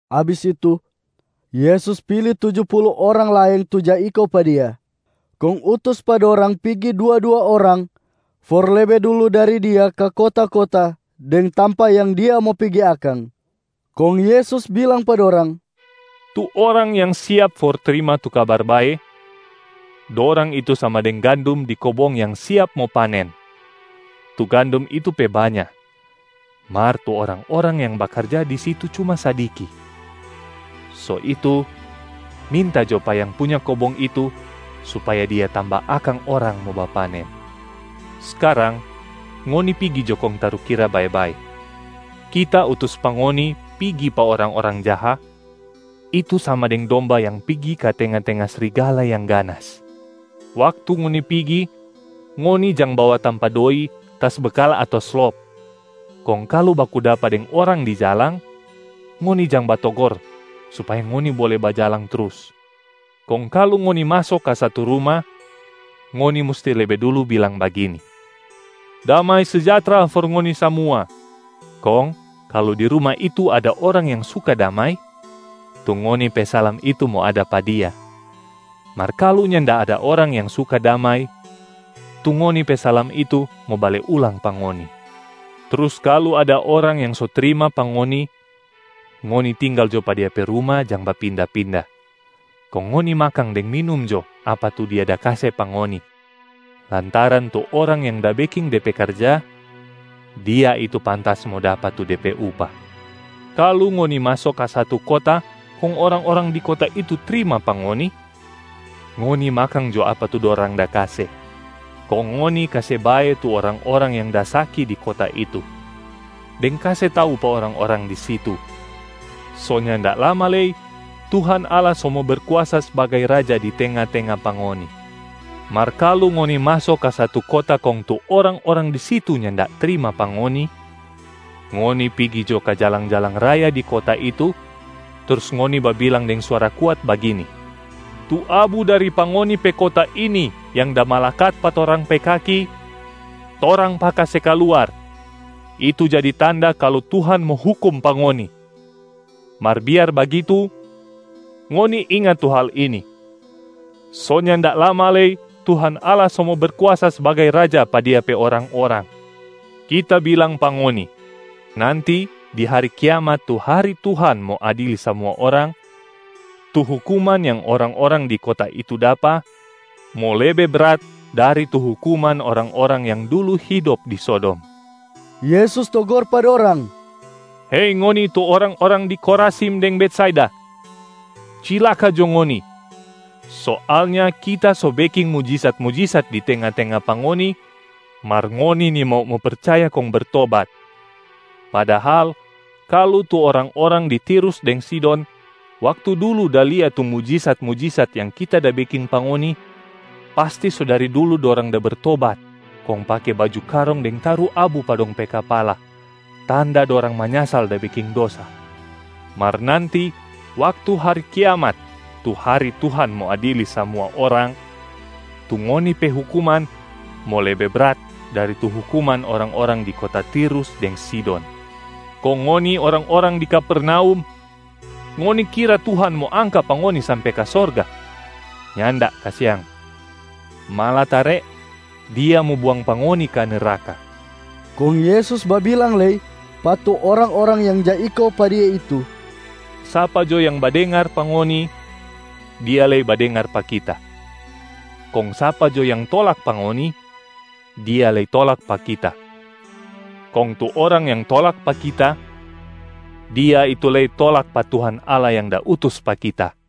Abis itu, Yesus pili tuju pulu orang laeng tu ja iko pa Dia. Kong utus pa dorang pigi dua-dua orang for lebe dulu dari Dia ka kota-kota deng tampa yang Dia mo pigi akang. Kong Yesus bilang pa dorang, “Tu orang yang siap for trima tu Kabar Bae, dorang itu sama deng gandum di kobong yang siap mo panen. Tu gandum itu pe banya, mar tu orang-orang yang bakarja di situ cuma sadiki. So itu minta jo pa Yang Punya kobong itu supaya Dia tamba akang orang mo bapanen. Skarang ngoni pigi jo kong tarukira bae-bae: Kita utus pa ngoni pigi pa orang-orang jaha, itu sama deng domba yang pigi ka tenga-tenga srigala yang ganas. Waktu ngoni pigi, ngoni jang bawa tampa doi, tas bekal ato slop. Kong kalu baku dapa deng orang di jalang, ngoni jang batogor supaya ngoni bole bajalang trus. Kong kalu ngoni maso ka satu ruma, ngoni musti lebe dulu bilang bagini, ‘Damai sejahtra for ngoni samua.’ Kong kalu di ruma itu ada orang yang suka damai, tu ngoni pe salam itu mo ada pa dia. Mar kalu nyanda ada orang yang suka damai, tu ngoni pe salam itu mo bale ulang pa ngoni. Trus kalu ada orang yang so trima pa ngoni, ngoni tinggal jo pa dia pe ruma jang bapinda-pinda. Kong ngoni makang deng minum jo apa tu dia da kase pa ngoni, lantaran tu orang yang da beking de pe karja, dia itu pantas mo dapa tu de pe upah. Kalu ngoni maso ka satu kota kong orang-orang di kota itu trima pa ngoni, ngoni makang jo apa tu dorang da kase. Kong ngoni kase bae tu orang-orang yang da saki di kota itu, deng kase tau pa orang-orang di situ, ‘So nyanda lama lei Tuhan Allah so mo Berkuasa sbagai Raja di tenga-tenga pa ngoni.’ Mar kalu ngoni maso ka satu kota kong tu orang-orang di situ nyanda trima pa ngoni, ngoni pigi jo ka jalang-jalang raya di kota itu trus ngoni babilang deng suara kuat bagini, ‘Tu abu dari pa ngoni pe kota ini yang da malakat pa torang pe kaki, torang paka se kaluar itu jadi tanda kalu Tuhan mo hukum pa ngoni. Mar biar bagitu, ngoni inga tu hal ini: so nyanda lama lei Tuhan Allah so mo Berkuasa sbagai Raja pa Dia pe orang-orang.’ Kita bilang pa ngoni, nanti di hari kiamat tu hari Tuhan mo adili samua orang, tu hukuman yang orang-orang di kota itu dapa mo lebe brat dari tu hukuman orang-orang yang dulu hidop di Sodom.” Yesus togor pa dorang, “Hei ngoni tu orang-orang di Khorazim deng Betsaida, cilaka jo ngoni! Soalnya Kita so beking mujisat-mujisat di tenga-tenga pa ngoni, mar ngoni nimau mo percaya kong bertobat. Padahal kalu tu orang-orang di Tirus deng Sidon waktu dulu da lia tu mujisat-mujisat yang Kita da beking pa ngoni, pasti so dari dulu dorang da bertobat kong pake baju karong deng taru abu pa dong pe kapala tanda dorang manyasal da beking dosa. Mar nanti waktu hari kiamat tu hari Tuhan mo adili samua orang, tu ngoni pe hukuman mo lebe brat dari tu hukuman orang-orang di kota Tirus deng Sidon. Kong ngoni orang-orang di Kapernaum, ngoni kira Tuhan mo angka pa ngoni sampe ka sorga? Nyanda kasiang. Malatare Dia mo buang pa ngoni ka neraka.” Kong Yesus babilang lei pa tu orang-orang yang ja iko pa Dia itu, “Sapa jo yang badengar pa ngoni, dia lei badengar pa Kita. Kong sapa jo yang tolak pa ngoni, dia lei tolak pa Kita, kong tu orang yang tolak pa Kita, dia itu lei tolak pa Tuhan Allah yang da utus pa Kita.”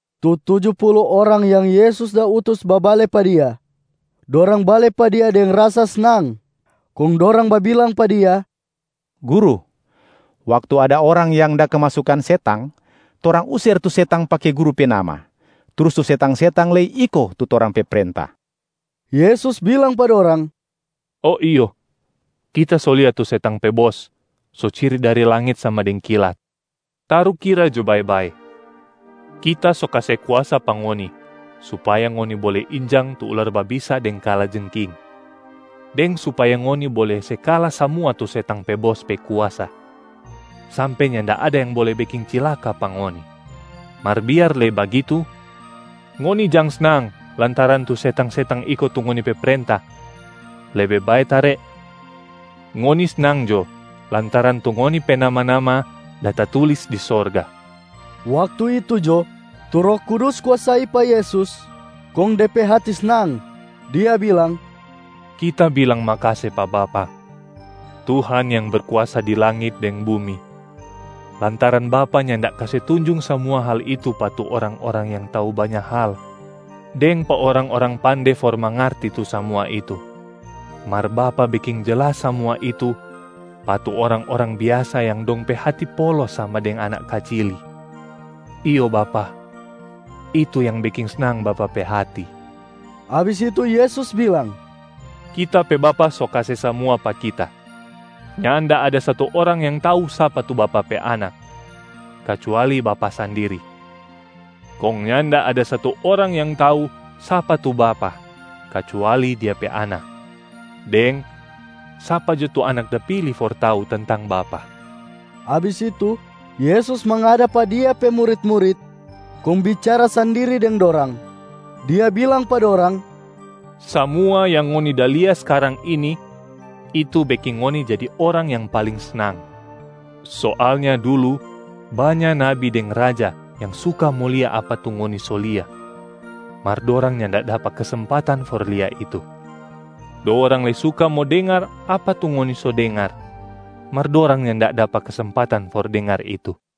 Tu tuju pulu orang yang Yesus da utus babale pa Dia. Dorang bale pa Dia deng rasa snang, kong dorang babilang pa Dia, “Guru, waktu ada orang yang da kemasukan setang, torang user tu setang pake Guru pe nama, trus tu setang-setang lei iko tu torang pe prenta.” Yesus bilang pa dorang, “Oh iyo. Kita so lia tu setang pe bos so ciri dari langit sama deng kilat. Tarukira jo bae-bae, Kita so kase kuasa pa ngoni supaya ngoni bole injang tu ular babisa deng kalajengking, deng supaya ngoni bole se kala samua tu setang pe bos pe kuasa, sampe nyanda ada yang bole beking cilaka pa ngoni. Mar biar lei bagitu, ngoni jang snang lantaran tu setang-setang iko tu ngoni pe prenta, lebe bae tare ngoni snang jo lantaran tu ngoni pe nama-nama da tatulis di sorga.” Waktu itu jo, tu Roh Kudus kuasai pa Yesus kong De pe hati snang. Dia bilang, “Kita bilang makase pa Bapa, Tuhan yang berkuasa di langit deng bumi, lantaran Bapa nyanda kase tunjung samua hal itu pa tu orang-orang yang tau banya hal deng pa orang-orang pande for mangarti tu samua itu. Mar Bapa beking jelas samua itu pa tu orang-orang biasa yang dong pe hati polos sama deng anak kacili. Iyo Bapa, itu yang beking snang Bapa pe hati.” Abis itu Yesus bilang, “Kita pe Bapa so kase samua pa Kita. Nyanda ada satu orang yang tau sapa tu Bapa pe Anak, kacuali Bapa sandiri. Kong nyanda ada satu orang yang tau sapa tu Bapa kacuali Dia pe Anak, deng sapa jo tu Anak da pili for tau tentang Bapa.” Abis itu Yesus mangada pa Dia pe murit-murit, kong bicara sandiri deng dorang, Dia bilang pa dorang, “Samua yang ngoni da lia skarang ini, itu beking ngoni jadi orang yang paling snang. Soalnya dulu banya nabi deng raja yang suka mo lia apa tu ngoni so lia, mar dorang nyanda dapa kesempatan for lia itu. Dorang lei suka mo dengar apa tu ngoni so dengar, mar dorang nyanda dapa kesempatan for dengar itu.”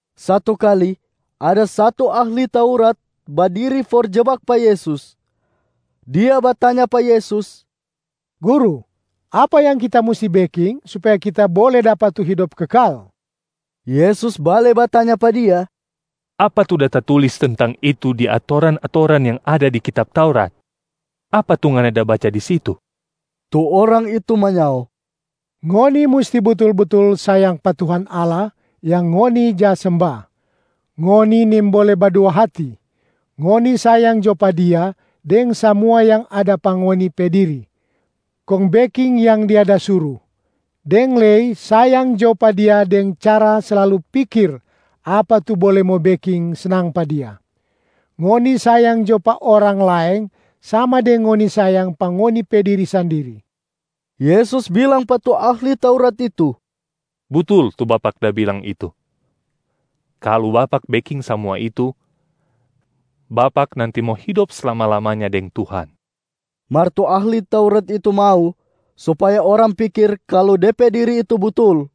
Satu kali, ada satu ahli Taurat badiri for jebak pa Yesus. Dia batanya pa Yesus, “Guru, apa yang kita musti beking supaya kita bole dapa tu hidop kekal?” Yesus bale batanya pa dia, “Apa tu da tatulis tentang itu di atoran-atoran yang ada di kitab Taurat? Apa tu ngana da baca di situ?” Tu orang itu manyao, “Ngoni musti butul-butul sayang pa Tuhan Allah yang ngoni ja semba, ngoni nimbole badua hati. Ngoni sayang jo pa Dia deng samua yang ada pa ngoni pe diri, kong beking yang Dia da suru, deng lei sayang jo pa Dia deng cara slalu pikir apa tu bole mo beking snang pa Dia. Ngoni sayang jo pa orang laeng sama deng ngoni sayang pa ngoni pe diri sandiri.” Yesus bilang pa tu ahli Taurat itu, “Butul tu bapak da bilang itu! Kalu bapak beking samua itu, bapak nanti mo hidop slama-lamanya deng Tuhan.” Mar tu ahli Taurat itu mau supaya orang pikir kalu de pe diri itu butul,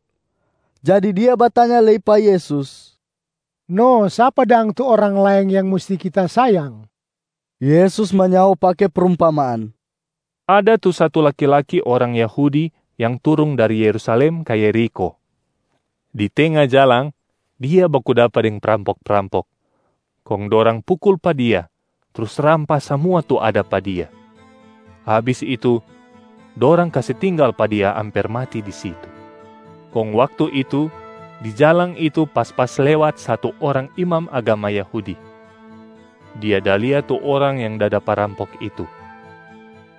jadi dia batanya lei pa Yesus, “No sapa dang tu orang laeng yang musti kita sayang?” Yesus manyao pake prumpamaan, “Ada tu satu laki-laki orang Yahudi yang turung dari Yerusalem ka Yerikho. Di tenga jalang, dia baku dapa deng prampok-prampok. Kong dorang pukul pa dia trus rampas samua tu ada pa dia. Abis itu, dorang kase tinggal pa dia amper mati di situ. Kong waktu itu di jalang itu pas-pas lewat satu orang imam agama Yahudi. Dia da lia tu orang yang da dapa rampok itu,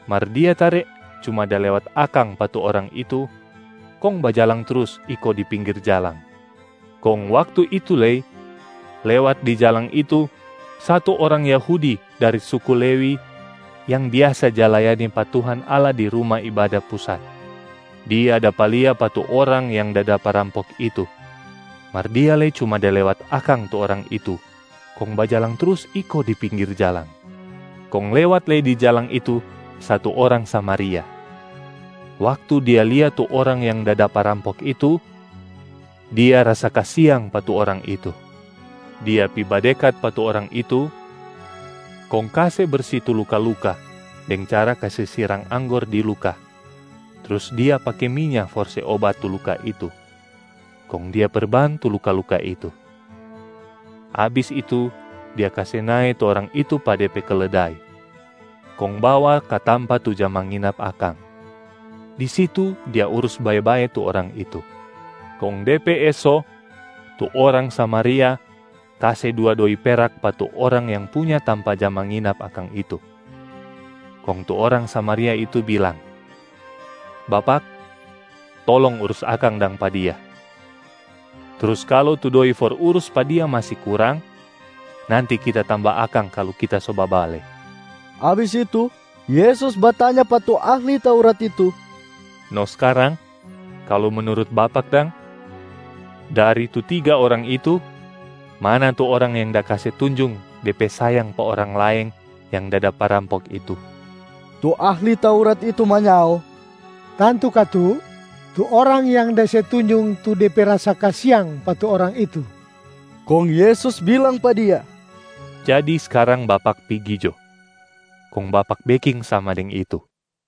mar dia tare cuma da lewat akang pa tu orang itu kong bajalang trus iko di pinggir jalang. Kong waktu itu lei, lewat di jalang itu satu orang Yahudi dari suku Lewi yang biasa ja layani pa Tuhan Allah di Ruma Ibada Pusat. Dia dapa lia pa tu orang yang da dapa rampok itu, mar dia lei cuma da lewat akang tu orang itu kong bajalang trus iko di pinggir jalang. Kong lewat lei di jalang itu satu orang Samariaa. Waktu dia lia tu orang yang da dapa rampok itu, dia rasa kasiang pa tu orang itu. Dia pi badekat pa tu orang itu kong kase bersi tu luka-luka deng cara kase sirang anggor di luka trus dia pake minya for se obat tu luka itu, kong dia perban tu luka-luka itu. Abis itu dia kase nae tu orang itu pa de pe keledai, kong bawa ka tampa tu ja manginap akang. Di situ dia urus bae-bae tu orang itu. Kong de pe eso, tu orang Samaria kase dua doi perak pa tu orang yang punya tampa ja manginap akang itu. Kong tu orang Samaria itu bilang, ‘Bapak, tolong urus akang dang pa dia. Trus kalu tu doi for urus pa dia masi kurang, nanti kita tamba akang kalu kita so babale.’” Abis itu Yesus batanya pa tu ahli Taurat itu, “No skarang, kalu menurut bapak dang, dari tu tiga orang itu, mana tu orang yang da kase tunjung de pe sayang pa orang laeng yang da dapa rampok itu.” Tu ahli Taurat itu manyao, “Tantu katu tu orang yang da se tunjung tu de pe rasa kasiang pa tu orang itu.” Kong Yesus bilang pa dia, “Jadi skarang bapak pigi jo, kong bapak beking sama deng itu.”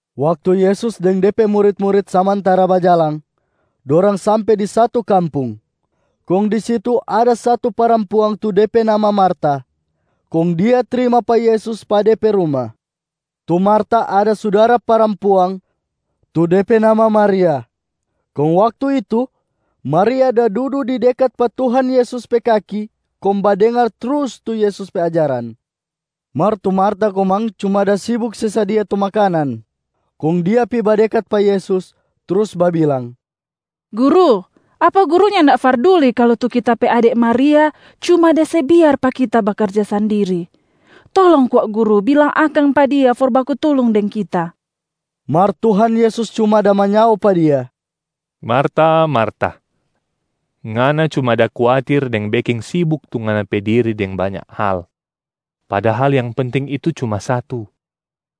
Waktu Yesus deng De pe murit-murit samantara bajalang, dorang sampe di satu kampung. Kong di situ ada satu parampuang tu de pe nama Marta, kong dia trima pa Yesus pa de pe ruma. Tu Marta ada sudara parampuang tu de pe nama Maria. Kong waktu itu, Maria da dudu di dekat pa Tuhan Yesus pe kaki kong badengar trus tu Yesus pe ajaran. Mar tu Marta komang cuma da sibuk se sadia tu makanan. Kong dia pi badekat pa Yesus trus babilang, “Guru, apa Guru nyanda farduli kalu tu kita pe ade Maria cuma da se biar pa kita bakarja sandiri? Tolong kwa Guru bilang akang pa dia for baku tulung deng kita.” Mar Tuhan Yesus cuma da manyao pa dia, “Marta, Marta, ngana cuma da kuatir deng beking sibuk tu ngana pe diri deng banya hal. Padahal yang penting itu cuma satu,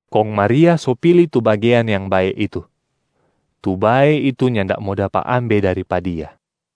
kong Maria so pili tu bagean yang bae itu. Tu bae itu nyanda mo dapa ambe dari pa dia.”